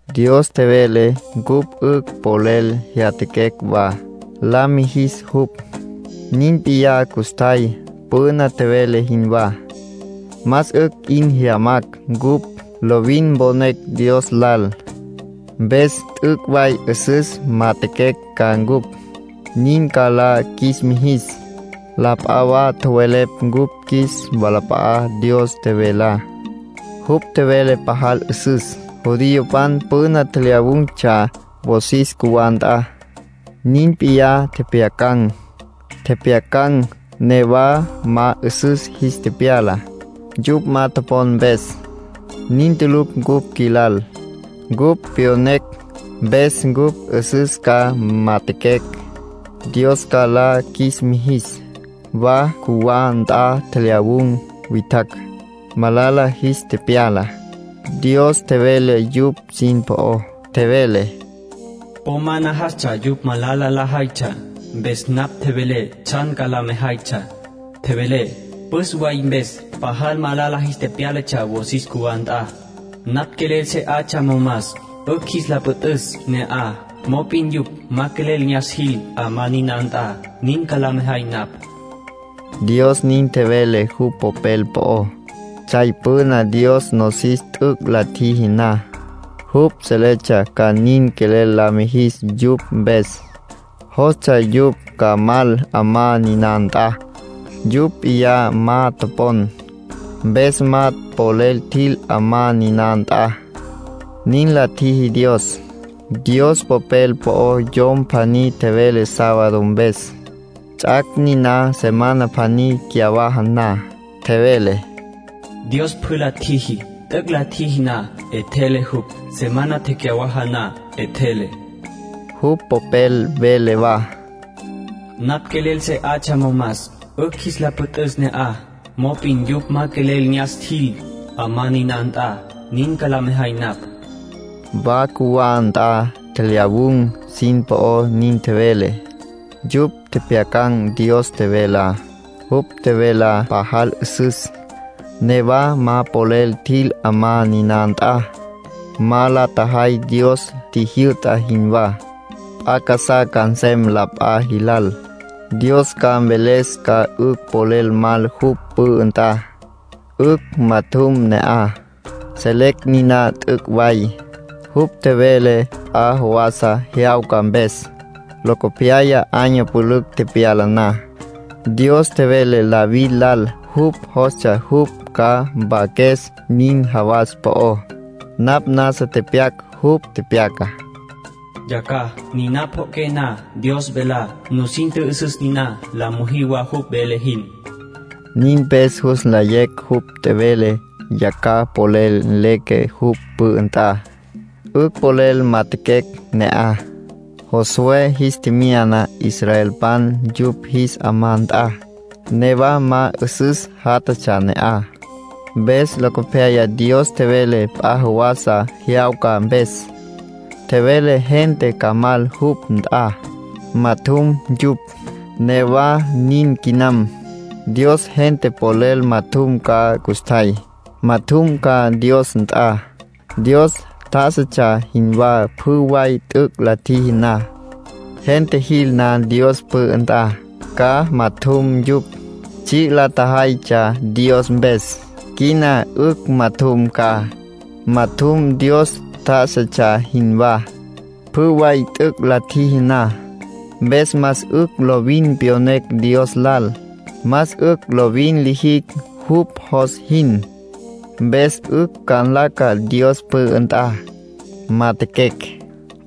Dios tjevele cupj 'ücj polel jyatjaquecj wa, la mijis jupj. Nin p'iyá custjay, püna tjevele jinwá. Más 'ücj 'in jyamacj cupj, lovin mponecj Dios lal. Mpes t'üc' way 'üsüs majatjaquecj ca cupj, nin ca la qjuis mijis. La p'a wa tjowelepj cupj qjuis walap'a'á Dios tjevelá. Jupj tjevelá pajal 'üsüs. Judiopan püna tjelyawun̈tsja wosis cjuwá nt'a, nin p'iyá tjepjyacan̈. Tjepjyacan̈, newa ma 'üsüs jis tepyala, yupj ma topon mpes. Nin tulucj cupj qjuilal. Cupj tepyonecj, mpes cupj 'üsüs ca majatjaquecj, Dios ca la qjuis mijis. Wa cjuwá nt'a tjelyawun̈ witjacj, malala jis tepyala. Dios tjevele yupj sin po'ó. Tjevele: “Po ma najastsja yupj malala lajaytsja. Mpes napj tjevelé tsjan ca la mejaytsja. Tjevelé: ‘Püs way mpes pajal malala jis tepyálatsja wosis cjuwá nt'a. Napj quelel se 'atsja momas, 'ücj jis la püt'üs ne'aj. Mop'in yupj ma polel ne'as jil 'amá niná nt'a, nin ca la mejay napj.’” Dios nin tjevele jupj Popel po'ó. Tsjay püna Dios nosis t'üc' la tjiji na, jupj seletsja ca nin quelel la mijis yupj mpes. Jostsja yupj ca mal 'amá niná nt'a. Yupj p'iyá ma topon, mpes ma polel tjil 'amá niná nt'a, nin la tjiji Dios. Dios Popel po'ó yom pjaní tjevele sábado mpes, ts'ac' niná semana pjaní cyawaja na. Tjevele: “Dios pjü la tjiji. T'üc' la tjiji na, 'etjele jupj. Semana tecyawaja na, 'etjele.” Jupj Popel vele wa: “Napj quelel se 'atsja momas, 'ücj jis la püt'üs ne'aj. Mop'in yupj ma polel ne'as jil 'amá niná nt'a, nin ca la mejay napj.” Wa cjuwá nt'a tjelyawün̈ sin po'ó nin tjevele. Yupj tjepjyacan̈ Dios tjevelá, jupj tjevelá pajal 'üsüs, newa ma polel tjil 'amá niná nt'a; ma la tjajay Dios tjijyü'ta jinwá. P'a casá ca nsem la p'a jilal. Dios ca mveles ca 'ücj polel mal jupj pü'ü nt'a, 'ücj majatjum ne'aj. Selecj niná t'üc' way. Jupj tjevele p'a jawasa jyawca mpes. Locopyaya, año pülücj tepyala na, Dios tjevele David lal jupj jostsja jupj ca mpaques nin jawas po'ó. Napj nasa tepyac jupj tepyacá. Tepyaca: “Yacjaj, niná pjo'oqué na Dios velá, nusin tjü'üsüs niná, la müjí wa jupj vele jin”. Nin mpes jus nlayecj jupj tjevele yacjaj polel leque jupj pü'ü nt'a, 'ücj polel majatjaquecj ne'aj. Josué jis tjemyana israelpan yupj jis 'amá nt'a, newa ma 'üsüs játjatsja ne'aj. Mpes locopyaya Dios tjevele p'a jawasa jyawca mpes; tjevele gente ca mal jupj nt'a, majatjum yupj. Newa nin quinam. Dios gente polel majatjum ca custjay. Majatjum ca Dios nt'a, Dios tjá'asatsja jinwá pjü way t'üc' la tjiji na. Gente jil na Dios pü'ü nt'a, ca majatjum yupj. Tsji' la tjajaytsja Dios mpes; quina 'ücj majatjum ca. Majatjum Dios tjá'asatsja jinwá, pjü way t'üc' la tjiji na. Mpes más 'ücj lovin pyonecj Dios lal; más 'ücj lovin lijicj jupj jos jin, mpes 'ücj ca nlaca Dios pü'ü nt'a, majatjaquecj.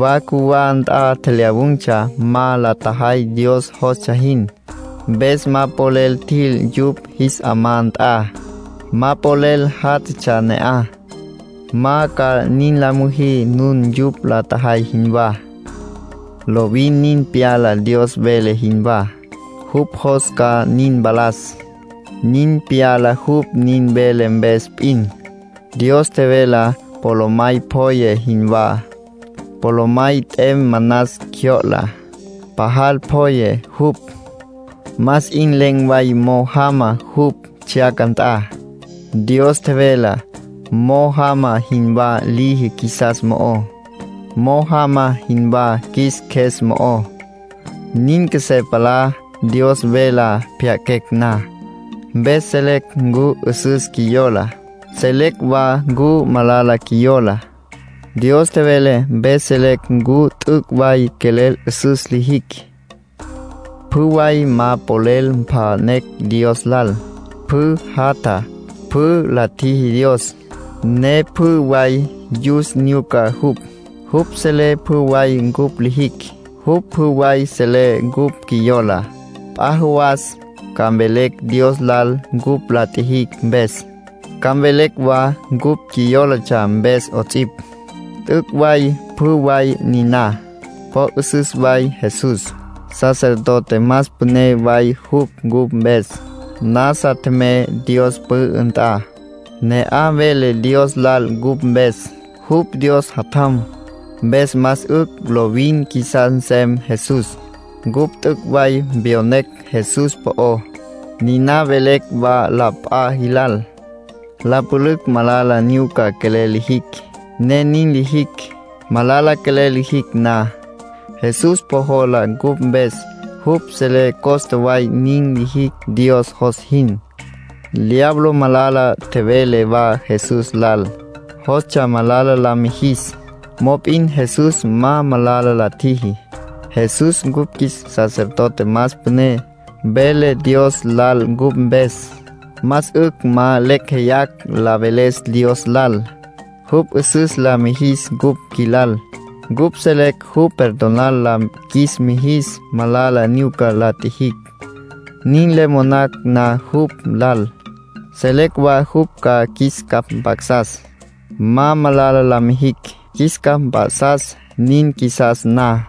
Wa cjuwá nt'a tjelyawun̈tsja ma la tjajay Dios jostsja jin. Mpes ma polel tjil yupj jis 'amá nt'a, ma polel játjatsja ne'aj. Ma ca nin la müjí nun yupj la tjajay jinwá. Lovin nin pyala Dios vele jinwá. Jupj jos ca nin mpalas, nin pyala jupj nin vele mpes p'in. Dios tjevelá polomay pjoye jinwá. Polomay t'em manas cjyo'la, pajal pjoye jupj, más 'in len̈ way mo'o jama jupj tsjyaca nt'a. Dios tjevelá mo'o jama jinwá liji qjuisas mo'ó. Mo'o jama jinwá qjuis qjues mo'ó. Nin qjuesé palá Dios velá pjya'aquecj na. Mpes selecj ncu 'üsüs qjuiyola, selecj wa ncu malala qjuiyola. Dios tjevele mpes selecj ncu t'üc' way quelel 'üsüs lijicj. Pjü way ma polel mpja'nen̈ Dios lal. Pjü jatja, pjü la tjiji Dios, ne pjü way yus nyuca jupj. Jupj selé pjü way cupj lijicj. Jupj pjü way selé cupj qjuiyola. P'a jawas ca mvelecj Dios lal cupj la tjijicj mpes, ca mvelecj wa cupj qjuiyólatsja mpes 'ots'ipj. T'üc' way pjü way niná. Po 'üsüs way Jesús. Sacerdote más püné way jupj cupj mpes. Nasa tjemey Dios pü'ü nt'a. Ne'aj vele Dios lal cupj mpes. Jupj Dios Jatjam. Mpes más 'ücj lovin qjuisas nsem Jesús. Cupj t'üc' way pyonecj Jesús po'ó, niná velecj wa la p'a jilal. La pülücj malala nyuca quelel lijicj, ne nin lijicj. Malala quelel lijicj na, Jesús po jola cupj mpes; jupj selé costa way nin lijicj Dios jos jin. Diablo malala tjevele wa Jesús lal, jostsja malala la mijis. Mop'in Jesús ma malala la tjiji. Jesús cupj qjuis sacerdote más püné, vele Dios lal cupj mpes. Más 'ücj ma lecj jeyacj la veles Dios lal. Jupj 'üsüs la mijis cupj qjuilal. Cupj selecj jupj perdonar la qjuis mijis malala nyuca la tjijicj, nin le monacj na jupj lal. Selecj wa jupj ca qjuis capj mp'a'sas, ma malala la mijicj. Qjuis capj mp'a'sas nin qjuisas na.